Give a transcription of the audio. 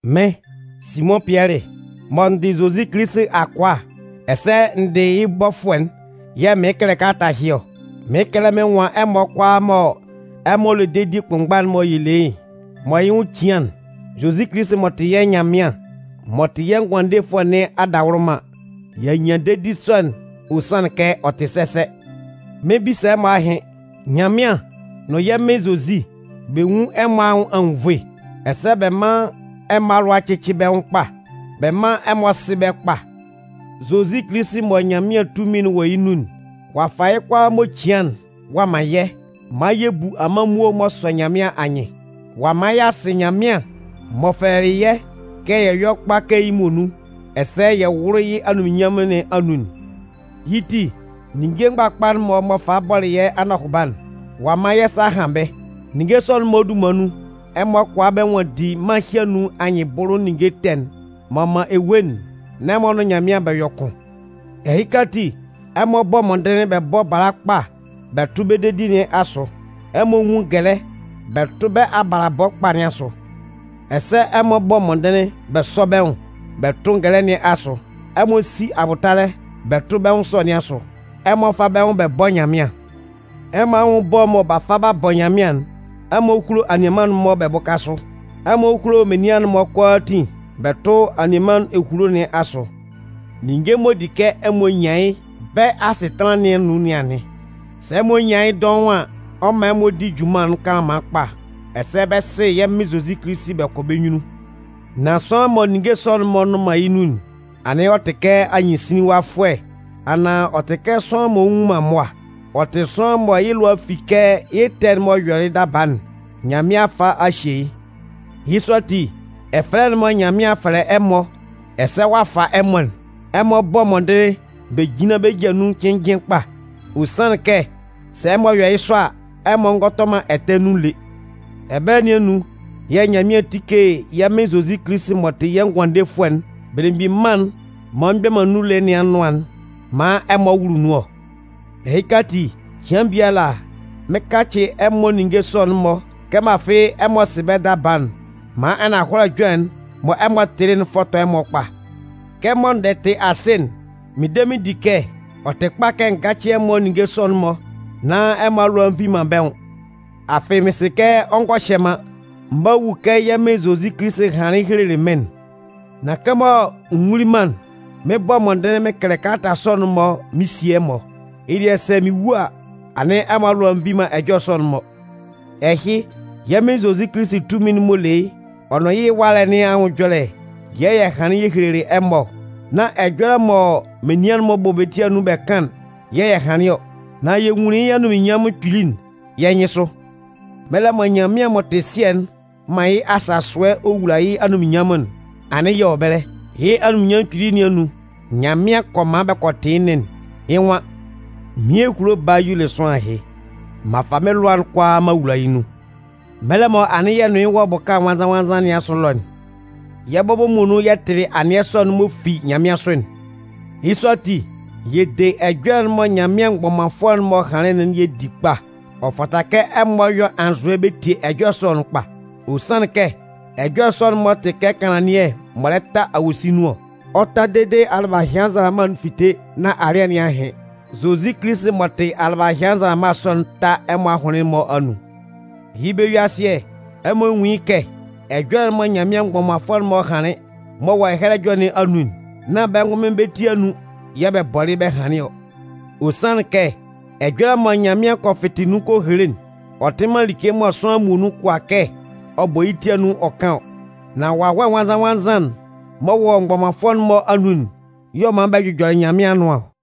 Mɩ́n, Simʋn Pɩɛlɩ, mɔ n dɩ Zozi Kilisi akʋa ɛsɛ n dɩ yɩ́ bɔfʋɛ'n yɛ̂ mɩɩn kɛlɛ kalata ɛhɩ ɔ. Mɩɩn kɛlɛ mɩn nwan ɛmɔ kʋalaa mɔ ɛmɔ le dedi kʋnmgba'n mɔ yɛ le yɩ́ mɔ yɩ́ nwʋn cian'n. Zozi Kilisi m'ɔ tɩ yɛ́ Nyanmɩan m'ɔ tɩ yɛ́ Ngʋandefʋɛ nɩn adawʋlʋman, y'a nyan dedi sɔ'n ɔ sanlɩn kɛ ɔ tɩ sɛsɛ. Mɩn 'bisa ɛmɔ ahɩn. Nyanmɩan nʋn yɛ́ Mɩn Zozi, bɛ nwún ɛmɔ anwʋn anwunnvoe, ɛsɛ bɛ́ man ɛmɔ alʋa cɩ́cɩ bɛ́ nwʋn kpa. Bɛ mán ɛmɔ sɩ́ bɛ́ kpa. Zozi Kilisi mɔ Nyanmɩan tunmin'n wɔ yɩ́ nun'n, ɔ'a fa yɩ́ kʋalaa m'ɔ cian'n ɔ'a man yɛ́ maan yɛ bu amanmuo m'ɔ sɔ Nyanmɩan anyɩn. Ɔ'a man y'a sɩ Nyanmɩan m'ɔ fɛlɛlɩ yɛ́ kɛ yɛ yɔ́ kpa kɛ yɩ́ muonun ɛsɛ yɛ wʋ́lʋ yɩ́ anunminnyanmʋn nɩn anun'n. Yɩ́ ti, ninnge mgbakpa'n-mɔ m'ɔ falɩ bɔlɩ yɛ́ anɔhʋba'n, ɔ'a man yɛ́ sa a han bɛ́. Ninnge sɔ'n-mɔ dunman nun, ɛmɔ kʋala bɛ nwanndi mân ɛhɩ anun anyɩnbʋlʋ ninnge ɛtɛ'n m'ɔ man ewue'n nán ɛmɔ nʋn Nyanmɩan bɛ yɔ kʋn. Ɛhɩka ati, ɛmɔ bɔ́ mɔndɩnlɩn bɛ bɔ́ bala kpa bɛ tʋ́ bɛ́ dedi nɩn asʋ. Ɛmɔ nwún ngɛlɛ bɛ tʋ́ bɛ́ abalabɔ kpa nɩn asʋ. Ɛsɛ ɛmɔ bɔ́ mɔndɩnlɩn bɛ sɔ́ bɛ́ nwʋn bɛ tʋ́ ngɛlɛ nɩn asʋ. Ɛmɔ sí abʋtalɛ bɛ tʋ́ bɛ́ nwʋn ɛsɔ nɩn asʋ. Ɛmɔ fá bɛ́ nwʋn bɛ bɔ́ Nyanmɩan. Ɛmɔ anwʋn ɛbɔ mɔ b'a fa b'a bɔ Nyanmɩan'n, ɛmɔ húlo anianman'n-mɔ bɛ bʋ́ka sʋ. Ɛmɔ húlo menian'n-mɔ kʋalaatin bɛ tʋ́ anianman'n-mɔ ehulo nɩn asʋ. Ninnge m'ɔ di kɛ ɛmɔ nyan yɩ́ bɛ́ asɩtanlan nɩn anun nɩn anɩn. Sɛ ɛmɔ nyan yɩ́ dɔʋn an, ɔ 'man ɛmɔ di junman'n kanlanman kpa ɛsɛ bɛ 'sɩ yɛ́ Mɩn Zozi Kilisi bɛ kɔ bɛ́ nyunnun. Nan sʋanlan mɔ ninnge sɔ'n-mɔ nnʋn man yɩ́ nun'n, anɩn ɔ tɩ kɛ anyɩnsinlinwafʋɛ anaan ɔ tɩ kɛ sʋanlan m'ɔ nnwun man mʋa. Ɔ tɩ sʋanlan mɔ yɩ́ lʋa a fi kɛ yɩ́ ɛtɛ'n m'ɔ yɔlɩ yɩ́ daba'n, Nyanmɩan a fa a hye yɩ́. Yɩ́ sɔ ati, ɛfɛlɛ'n mɔ Nyanmɩan a fɛlɛ ɛmɔ ɛsɛ ɔ'a fa ɛmɔ'n, ɛmɔ bɔ́ mɔndɩnlɩn bɛ jínlan nun cɩnnjɩn kpa. Ɔ sanlɩn kɛ sɛ ɛmɔ yɔ yɩ́ sɔ a, ɛmɔ ngɔ tɔ man ɛtɛ nun lé. Ɛbɛlɛ nɩn anun yɛ̂ Nyanmɩan 'tike yɛ́ Mɩn Zozi Kilisi m'ɔ tɩ yɛ́ Ngʋandefʋɛ'n Belemgbin Mân'n m'ɔ mgbɛ man nun lé nɩn anʋan'n maan ɛmɔ wʋlʋ nun ɔ. Ɛhɩka ati, cɩan biala mɩn 'kacɩ ɛmɔ ninnge sɔ'n-mɔ kɛmɔ afɩ ɛmɔ sɩ bɛ́ daba'n maan ananhɔlɛ ɛjɔlɛ'n mɔ ɛmɔ tɩlɩ'n fɔtɔ ɛmɔ kpa. Kɛmɔ n dɛ tɩ asɩ'n, mɩn de mɩn di kɛ ɔ tɩ kpa kɛ n gácɩ ɛmɔ ninnge sɔ'n-mɔ nán ɛmɔ alʋa a nvi man bɛ́ nwʋn. Afɩ mɩn sɩ kɛ ɔ ngɔ hyɛ man, m 'ba wu kɛ yɛ́ Mɩn Zozi Kilisi hanlɩn helelɩ mɩ́n'n. Nan kɛmɔ n wuli man'n, mɩn 'bɔ mɔndɩnlɩn mɩn kɛlɛ kalata sɔ'n-mɔ mɩn sie ɛmɔ. Yɩ́ dɩɛ sɛ mɩn wu a, anɩn ɛmɔ alʋa nvi man ɛjɔlɛ sɔ'n-mɔ. Ɛhɩ, yɛ́ Mɩn Zozi Kilisi tunmin m'ɔ le yɩ́ ɔ nʋn yɩ́ ɛwalɛ nɩn anwʋn ɛjɔlɛ yɛ̂ yɛ hanlɩn yɛ helelɩ ɛmɔ ɔ. Nán ɛjɔlɛ mɔ menian'n-mɔ bɔ bɛ́ ti anun bɛ kan'n yɛ̂ yɛ hanlɩn ɔ. Nan yɛ nwunlin yɩ́ anunminnyanmʋn kpili'n yɛ́ nyɩnsʋ. Mɛlɛ mɔ Nyanmɩan m'ɔ tɩ Sɩɛ'n 'man yɩ́ asasʋɛ ɔ wula yɩ́ anunminnyanmʋn'n, anɩn yɛ wɔ ɛbɛlɛ. Yɩ́ anunminnyanmʋn kpili nɩn anun, Nyanmɩan kɔ man bɛ kɔ tɩ yɩ́ nɩn'n. Yɩ́ nwan: “Mɩ́n ehulo Baa y'ɔ le sʋanlan ɛhɩ. M'an fa mɩ́n lʋa'n kʋalaa m'an wula yɩ́ nun.” Mɛlɛ mɔ anɩn yɛ nʋn yɩ́ wɔ bʋka nwannzan-nwannzan nɩn asʋ ɛlɔ'n, yɛ́ bɔbɔ muonun yɛ tɩlɩ anɩɛ sɔ'n m'ɔ fi nyanmɩansʋ'n. Yɩ́ sɔ ati, yɛ de ɛjɔlɛ'n mɔ Nyanmɩan mgbɔmanfʋɛ'n-mɔ hanlɩn'n yɛ di kpa. Ɔ fata kɛ ɛmɔ yɔ anzʋɛ bɛ tie ɛjɔlɛ sɔ'n kpa. Ɔ sanlɩn kɛ ɛjɔlɛ sɔ'n-mɔ tɩ kɛ kanlannɩɛ m'ɔ lɛ ta awosin nun ɔ. Ɔ 'ta dede alɩbahɩan nzalama'n fite nán alɩ́ɛ nɩn a hɩn. Zozi Kilisi m'ɔ tɩ kɛ alɩbahɩan nzalama sɔ'n 'ta ɛmɔ ahʋnlɩn'n-mɔ anun. Yɩ́ bɛ-yue-asɩɛ, ɛmɔ nwún yɩ́ kɛ, ɛjɔlɛ'n mɔ Nyanmɩan mgbɔmanfʋɛ'n-mɔ hanlɩn, m'ɔ wɔ Ɛhɛlɛ Ɛjɔlɛ nɩn anun'n, nán bɛ́ ngʋnmɩn bɛ́ ti anun yɛ̂ bɛ bɔlɩ bɛ́ hanlɩn ɔ. Ɔ sanlɩn kɛ ɛjɔlɛ mɔ Nyanmɩan kɔ fɩtɩ nun ɔ kɔ hele'n, ɔ tɩ man like mɔ sʋanlan muonun kʋala kɛ ɔ bɔ yɩ́ ti anun ɔ kan ɔ. Nan Wawɛ Nwannzan-nwannzan'n m'ɔ wɔ mgbɔmanfʋɛ'n-mɔ anun'n y'ɔ man bɛ jʋjɔlɩ Nyanmɩan anʋan ɔ.